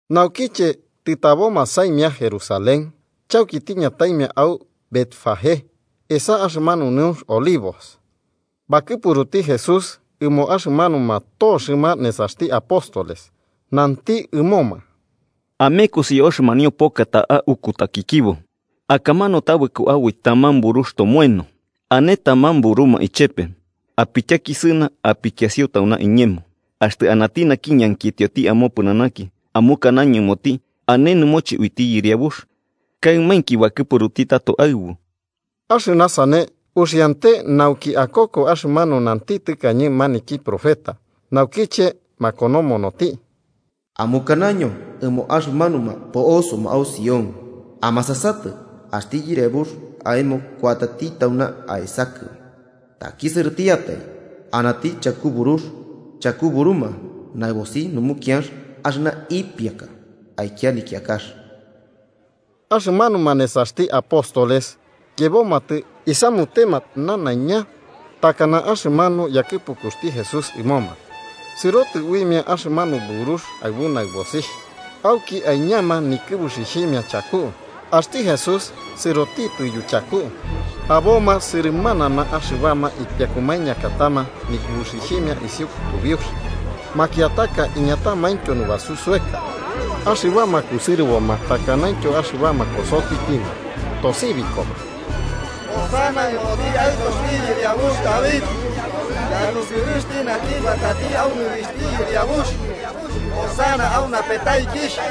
Naukiche tɨtaboma saimia Jerusalén chauki tiñataimia au Betfagé, esa axɨmanu Nɨunx Olivos, bakɨpruti Jesús ɨmo axɨmanuma toxɨma nesaxti apóstoles, nanti ɨmoma: –Amekosi au axɨmanio poka ta'a ukutakɨkibo. Akamanu tabɨko aboi taman burux tomoeno, ane taman buruma ichepe. Apityakisɨna apikiasio tauna iñemo. Axtɨ anati naki ñankitioti amopɨnanaki, amukanaño ɨmoti ane nɨmoche uiti Yɨriabux kaɨmainki bakɨpuruti tato aɨbu. Axɨna sane uxiante nauki akoko axɨmanu nanti tɨkañe naki profeta, naukiche makonomonoti: “Amukanaño ɨmo axɨmanuma po'osoma au Sión: ‘Amasasatɨ, axti yɨriabux aemo kuatati tauna aesakɨ, takisɨrɨtiatai, anati chaku burux, chaku buruma, naɨbosi numukianx axɨna ipiaka aikia nikiakax.’” Axɨmanuma nesaxti apóstoles yebomatɨ isamutema nanaiña takana axɨmanu yakɨpukuxti Jesús ɨmoma. Sɨrotɨ uimia axɨmanu burux aɨbu naɨbosixh, auki aiñama nikɨbuxixhimia chaku, axti Jesús sɨroti yuchaku. Aboma sɨrɨmanama. Axɨbama ipiakumainkiatama nikɨbuxixhimia isiu kutubiux, makiataka iñatamaintyo nubasu soeka. Axɨbama kusɨrɨboma takanaintyo axɨbama kosotikimia, tosibikoma: –¡Hosana ɨmoti Aɨtoxti yɨriabux David! ¡Yarusɨrɨxti naki kuatati au nɨrixhti Yɨriabux! ¡Hosana au napetaikixh!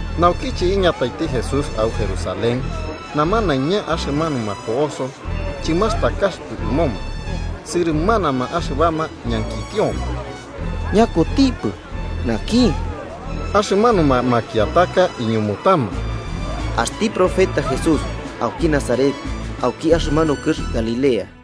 Naukiche iñataiti Jesús au Jerusalén, namanaiña axɨmanuma po'oso chɨmastakaxɨpɨ ɨmoma, sɨrɨmanama axɨbama ñankitioma: –¿Ñakutipɨ naki? Axɨmanuma makiataka iñumutama: –Axti profeta Jesús auki Nazaret auki axɨmanu kɨx Galilea.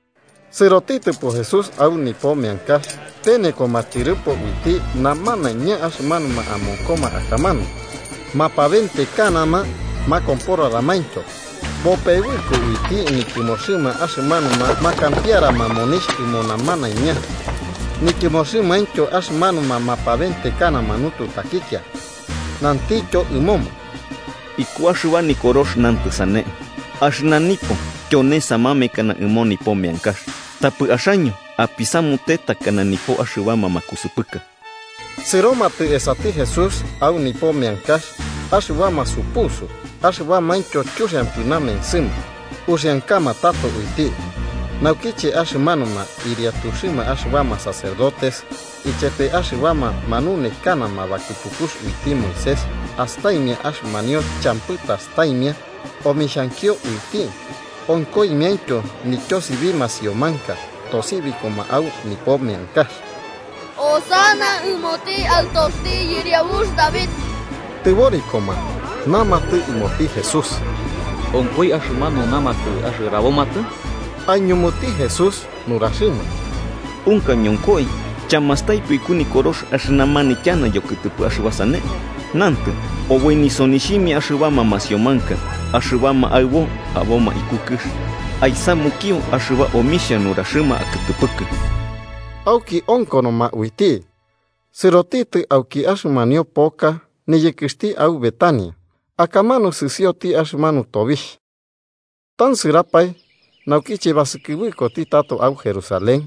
Sɨrotitɨpo Jesús au nipo meankax penekoma tyɨrɨpo uiti namanaiña axɨmanuma amonkoma akamanu mapabentekanama makomporaramaintyo. Bopebɨko uiti nityɨmoxɨma axɨmanuma makampiarama monixh ɨmo namanaiña, nityɨmoxɨmaintyo axɨmanuma mapabentekanama nututakikia. Nantityo ɨmoma: –Iku axɨba Nikorox nantɨ sane: ‘Axɨna nipo tyone samamekana ɨmo nipo meankax’, tapɨ axaño apisamute takana nipo axɨbama makusɨpɨka. Sɨromatɨ esati Jesús au nipo meankax axɨbama supusu axɨbamaintyo chuxiampɨ namensɨma, uxiankama tato uiti. Naukiche axɨmanuma ɨriatuxɨma axɨbama sacerdotes ichepema axɨbama manunekanama bakɨpukux uiti Moisés astaimia axɨmanio champɨ tastaimia omixhankio uiti, onkoimiaintyo nityosibi masiomanka tosibikoma au nipo meankax: “¡Hosana ɨmoti Aɨtoxti yɨriabux David!”, tɨborikoma namatɨ ɨmoti Jesús: –¿Onkoi axɨmanu namatɨ axɨrabomatɨ? Aiñumuti Jesús nuraxɨma: –Unka, ñonkoi. ¿Chamastaipɨ iku Nikorox axɨna manityana yokɨtɨpɨ axɨba sane? Nantɨ: ‘Oboi nisonixhimia axɨbama masiomanka, axɨbama aɨbo aboma iku kɨx, aisamukio axɨba omixhia nuraxɨma akɨtɨpɨkɨ.’ Auki onkonoma uiti, sɨrotitɨ auki axɨmanio poka niyɨkɨxti au Betania, akamanu sɨsioti axɨmanu tobixh. Tansɨrapae, naukiche basɨkɨbɨkoti tato au Jerusalén,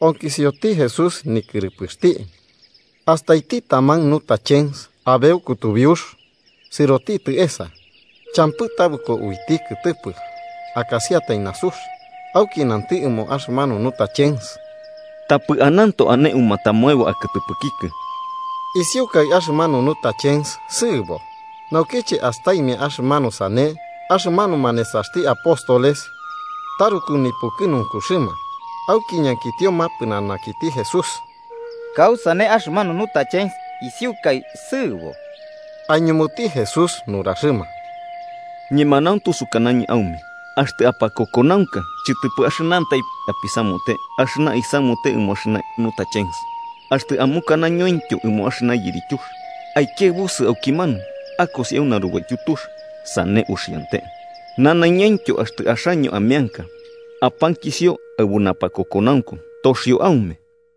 onkisioti Jesús nikɨrɨpɨxti. Astaiti taman nutachens abeu kutubiux sɨrotitɨ esa, champɨ tabɨko uiti kɨtɨpɨ akasiatai nasux. Auki nanti ɨmo axɨmanu nutachens: –¡Tapɨ ananto ane umatamoebo akɨtɨpɨkikɨ! Isiukai axɨmanu higuera sɨɨbo. Naukiche astaimia axɨmanu sane, axɨmanuma nesaxti apóstoles taruku nipukɨnunkuxɨma auki ñankitioma pɨnanakiti Jesús: –¿Kausane axɨmanu higuera isiukai sɨɨbo? Aiñumuti Jesús nuraxɨma: –Ñemanauntu sukanañɨ aume axtɨ apakokonaunka, chɨtɨpɨ axɨnantai apisamute axɨna isamute ɨmo axɨna higuera, axtɨ amukanañointyo ɨmo axɨna yirityux: ‘Aikiaɨbusɨ aukimanu akosi au narubaityu tux’, sane uxiante. Nanaiñaintyo axtɨ axaño, ameanka, apankisio aɨbu napakokonaunku, toxio aume.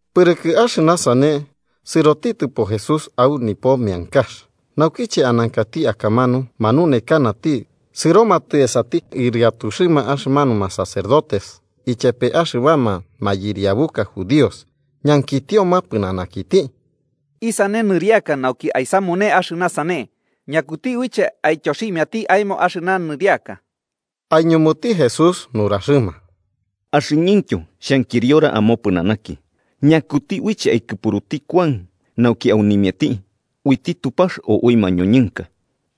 Pɨrɨkɨ axɨna sane, sɨrotitɨpo Jesús au nipo meankax. Naukiche anankati akamanu, manunekanati, sɨromatɨ esati ɨriatuxɨma axɨmanuma sacerdotes ichepe axɨbama mayɨriabuka judíos, ñankitioma pɨnanakiti: –¿Isane nɨriaka nauki aisamune axɨna sane? ¿Ñakuti uiche aityoximiati aemo axɨna nɨriaka? Aiñumuti Jesús nuraxɨma: –Axɨñɨntyo xhankiriora amopɨnanaki: ¿Ñakuti uiche aikɨpuruti Kuan nauki aunimiati, uiti Tupax o ui mañoñɨnka?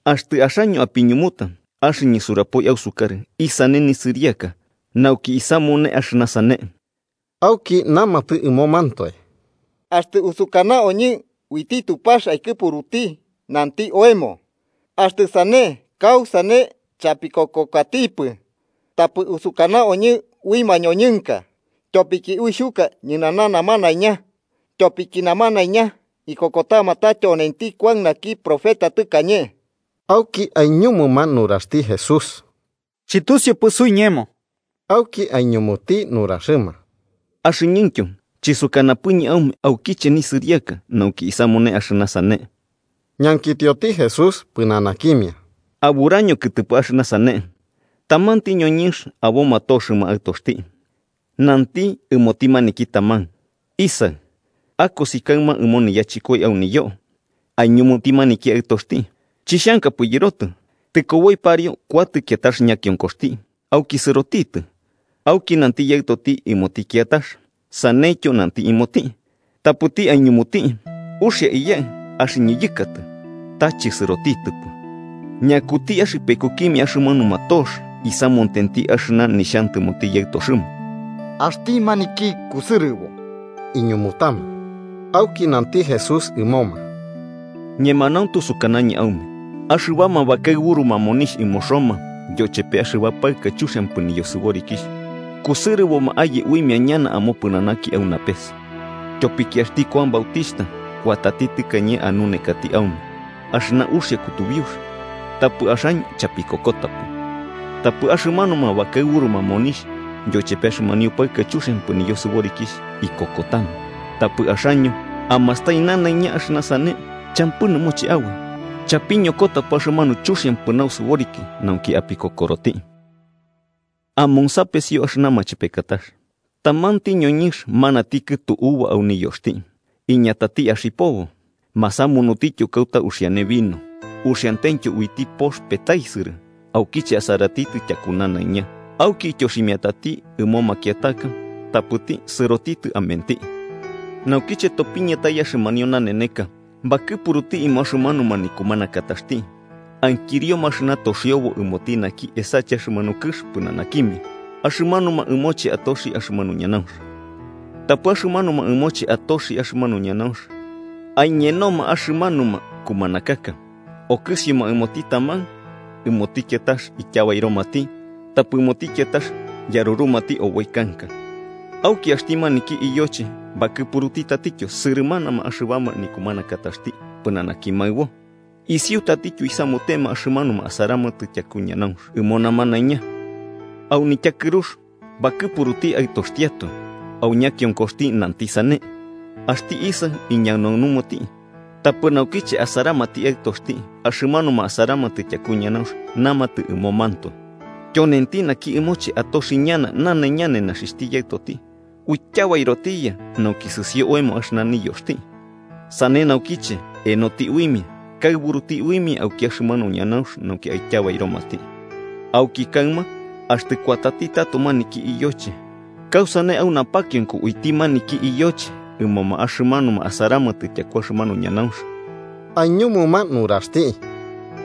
Axtɨ axaño apiñumuta, axɨñɨ surapoi ausukarɨ isane nisɨriaka nauki isamune axɨna sane. Auki namatɨ ɨmomantoe: “Axtɨ usukanaoñɨ uiti Tupax aikɨpuruti, nanti oemo: ‘Axtɨ sane, ¿kausane chapikokokatipɨ?’ Tapɨ usukanaoñɨ ui mañoñɨnka, tyopiki uixhuka ñɨnana namanaiña, tyopiki namanaiña ikokotama ta tyonenti Kuan naki profeta tɨkañe.” Auki aiñumuma nuraxti Jesús: –Chɨtusiupɨ suiñemo. Auki aiñumuti nuraxɨma: –Axɨñɨntyo chisukanapɨñɨ aume aukiche nisɨriaka nauki isamune axɨna sane. Ñankitioti Jesús pɨnanakimia: –¿Aburaño kɨtɨpɨ axɨna sane? Tamanti ñoñɨnx aboma toxɨma aɨtoxti, nanti ɨmoti maniki taman: ‘Isaɨ, akosi kaɨma ɨmo niyachɨkoi au niyoo.’ Aiñumuti maniki aɨtoxti: ‘¡Chixhankapɨ yɨrotɨ!’ Tɨkoboi pariu kuatɨ kiatax ñakionkoxti, auki sɨrotitɨ. Auki nanti yaɨtoti ɨmoti kiatax, saneityo nanti ɨmoti. Tapɨti aiñumuti: ‘Uxia, iyaɨ, axɨñɨ yɨkatɨ.’ Ta chɨsɨrotitɨpɨ. ¿Ñakuti axɨpekukimia axɨmanuma tox isamutenti axɨna nixhantɨmoti yaɨtoxɨma? –Axti maniki kusɨrɨbo–iñumutama. Auki nanti Jesús ɨmoma: –Ñemanauntu sukanañɨ aume axɨbama bakaɨburuma monixh ɨmo Roma, yochepe axɨba paɨka chuxiampɨ niyosɨborikixh, kusɨrɨboma aye uimia ñana amopɨnanaki au napes. Tyopiki axti Kuan Bautixhta kuatati tɨkañe anunekati aume axɨna uxia kutubiux, tapɨ axaño chapikokotapɨ. Tapɨ axɨmanuma, bakaɨburuma monixh yochepe axɨmanio paɨka chuxiampɨ niyosɨborikixh ikokotama. Tapɨ axaño, amastai nanaiña axɨna sane, champɨ nɨmoche aboi chapiñokotapɨ axɨmanu chuxiampɨ nausɨboriki nauki apikokoroti. “Amonsapesio axɨna machepekatax: Tamanti ñoñɨnx manati kɨtu uva au niyoxti iñatati axipobo. Masamunutityo kauta uxiane vino uxiantentyo uiti pox petaisɨrɨ aukiche asaratitɨ tyaku nanaiña. Auki ityoximiatati ɨmo makiataka tapɨti sɨrotitɨ amenti. Naukiche topiñatai axɨmanio naneneka, bakɨpuruti ɨmo axɨmanuma nikumanakataxti ankirioma axɨna toxiobo ɨmoti naki esache axɨmanu kɨx pɨnanakimia axɨmanuma ɨmoche atoxi axɨmanu ñanaunx. Tapɨ axɨmanuma ɨmoche atoxi axɨmanu ñanaunx aiñenoma axɨmanuma kumanakaka: okɨsimia ɨmoti taman, ɨmoti kiatax ityabairomati tapɨ ɨmoti kiatax yarurumati oboi kanka. Auki axti maniki iyoche bakɨpuruti tatityo sɨrɨmanama axɨbama nikumanakataxti pɨnanaki maɨbo. Isiu tatityo isamutema axɨmanuma asaramatɨ tyaku ñanaunx ɨmo namanaiña. “Au nityakɨrux bakɨpuruti aɨtoxtiatoe, au ñakionkoxti nanti sane: ‘Axti isaɨ iñanaunumati.’ Tapɨ naukiche asaramati aɨtoxti, axɨmanuma asaramatɨ tyaku ñanaunx namatɨ ɨmomantoe: ‘Tyonenti naki ɨmoche atoxi ñana nanaiña nenaxixhti yaɨtoti. Uityabairotiya nauki sɨsio oemo axɨna niyoxti.’ Sane naukiche enoti uimia, kaɨburuti uimia auki axɨmanu ñanaunx nauki aityabairomati. “Auki kaɨma, axtɨ kuatati tato maniki iyoche, ¿kausane au napakionko uiti maniki iyoche ɨmoma axɨmanuma asaramatɨ tyaku axɨmanu ñanaunx?” Aiñumuma nuraxti: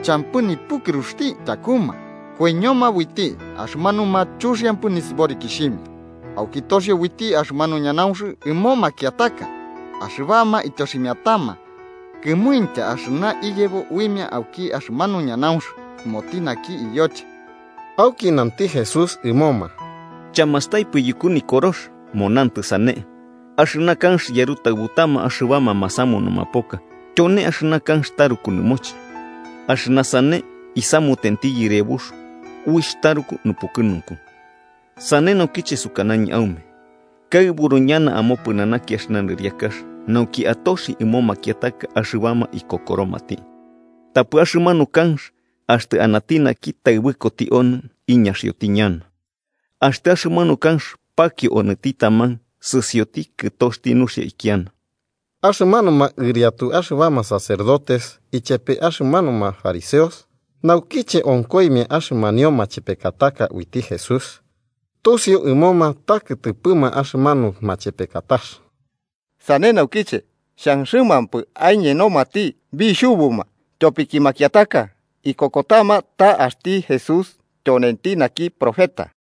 –Champɨ nipukɨruxti tyakuma koiñoma uiti axɨmanuma chuxiampɨ nisɨborikixhimia, auki toxio uiti axɨmanu ñanaunx ɨmo makiataka axɨbama ityoximiatama kɨmuintya axɨna iyebo uimia auki axɨmanu ñanaunx ɨmoti naki iyoche. Auki nanti Jesús ɨmoma: –¿Chamastaipɨ yuku Nikorox? Monantɨ sane: ‘Axɨna kanx yarutaɨbutama axɨbama masamunuma poka tyone axɨna kanx taruku nɨmoche. Axɨna sane isamutenti Yɨriabux, uixh taruku nupukɨnunku.’ Sane naukiche sukanañɨ aume kaɨburu ñana amopɨnanaki axɨna nɨriakax, nauki atoxi ɨmo makiataka axɨbama ikokoromati. Tapɨ axɨmanu kanx, axtɨ anati naki taɨbɨkoti onɨ iñaxioti ñana. Axtɨ axɨmanu kanx pakio onɨti taman, sɨsioti kɨtoxti nuxia kiana. Axɨmanuma ɨriatu axɨbama sacerdotes ichepe axɨmanuma fariseos, naukiche onkoimia axɨmanio machepekataka uiti Jesús, tusiu ɨmoma ta kɨtɨpɨma axɨmanu machepekatax. Sane naukiche xanxɨmampɨ aiñenomati, bixhubuma, tyopiki makiataka ikokotama axti Jesús tyonenti naki profeta.